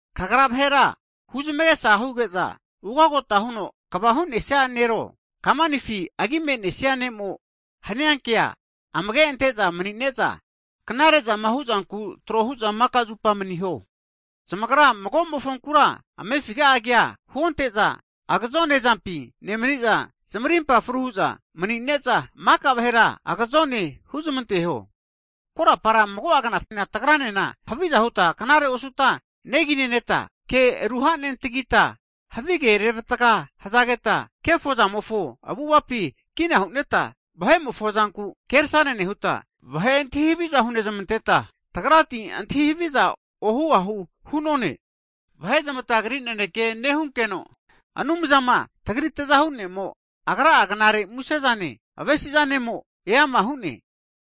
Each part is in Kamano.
Kagra vahera huzmagesa huge'za, ugagota huno kva hu'nesia nero, kamanifi agi me'nesia ne'mo hania kea amage' ante'za mani'ne'za, knare'zama hu'zanku trohu'za maka'zupa maniho. Zamagra mago mofonkura amefiga'a kea huonte'za, agazone zampi nemni'za, zamarimpa fru hu'za mani'ne'za, maka vahera agazone huzmanteho, Korapara mago'a knafina tagra'nena, haviza huta knare osuta negi neneta, ke ru hanentagita, havige reravatga hzageta, kefo zamofo avu'avapi kina hu'neta, vahe'mofo zanku kersane nehuta, vahe antahi haviza hunezmanteta, tagrati antahi haviza ohu ahu hu'none. Vahe zamatagri naneke nehunkeno, Anumzama, tagri Tzahu ne'mofo Agri'a knare muse'zane, avesi'zanemo eama hu'ne.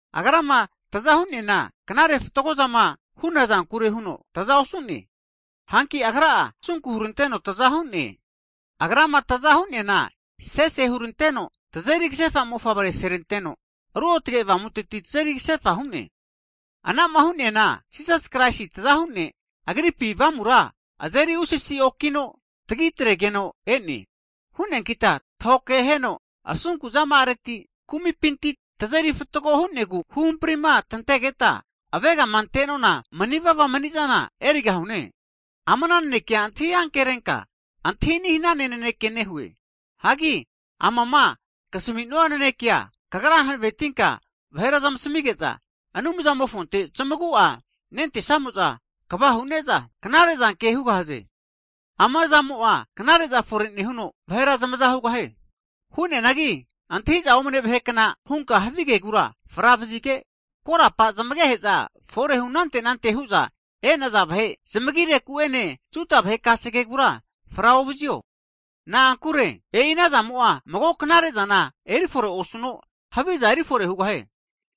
Agrama tza hu'neana, knare fatgozama hu'na zankure huno tza osu'ne, hanki Agra'a asunku huranteno tza hu'ne. Agrama tza hu'neana sese huranteno, tazeri ksefa mofavre seranteno Ruotge Avamuteti tazeri ksefa hu'ne. Anama hu'neana Jisasi Kraisi tzahu ne', Agripi Avamura azeri usasi okino tagi tregeno e'ne. Hu'neankita tahokeheno asunku zama'areti, kumipinti tazeri fatgo hu'negu huhamprima tantegeta avegama ante'nona mani'vava mani'zana erigahune. Ama'na nanekea antahi ankerenka, antahi ani' hanana naneke nehue. Hagi amama ksami'nua nanekea kagra hanavetinka vahera zamasmige'za, Anumzamofonte zamagu'a nentesamo'za kva hu'ne'za knare zanke'za hugahaze. Ama zamo'a knare'za fore nehuno, vahera zamaza hugahie. Hu'neanagi, antahi'za omne vahe kna hunka havi kegura fra vazige, korapa zamagehe'za forehu anante anante hu'za e'naza vahe zamagireku ene Juda vahe kase kegura fra ovazio. Na'ankure e'i anazamo'a mago knare'zana erifore osuno, haviza eri fore hugahie.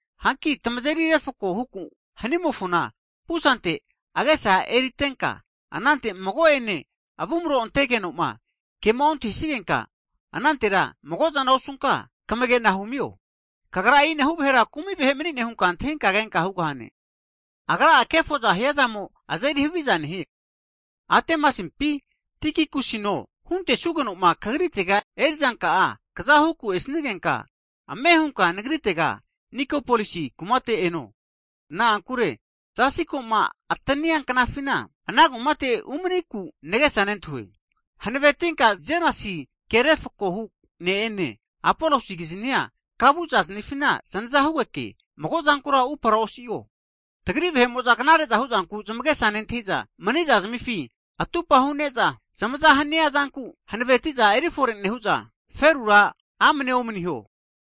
Hanki tmazeri refko huku hnimofona pusante agesa eritenka, anante mago'ene avumro antegeno'ma kema ontahisigenka, anantera mago'zana osunka kmagena humio. Kagra e'inahu vahera kumi' vahe mani'ne hunka antahinka kenka hugahane, agra'a kefoza hiazamo azeri haviza nehie. Atemasimpi, Tikikusino hunte'sugenoma kagritega erizanka'a kza huku esnigenka, ame hunka nagritega Nikopolisi kumate eno, na'ankure zasi ko'ma atania knafina, ana kumate umaniku nagesa nentahue. Hanavetinka Zenasi ke refkohu (lawyer) ne'ene, Apolosi kiznia ka vu zaznifina znaza hugeke magozankura upara osi'o. Tagri vahe'mo'za knare'za hu'zanku zamagesa nentahi'za, mani'za zamifi atupa hu'ne'za zamaza hania zanku hanaveti'za eri fore nehu'za, ferura amnea omniho.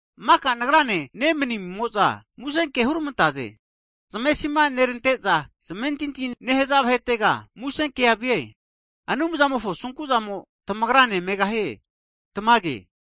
Maka nagrane nemnimo'za musenke hurmantaze. Zamesima nerante'za, zamentinti nehza vahetega musenke vie. Anumzamofo asunku'zamo tamagra ne megahie. Tamage.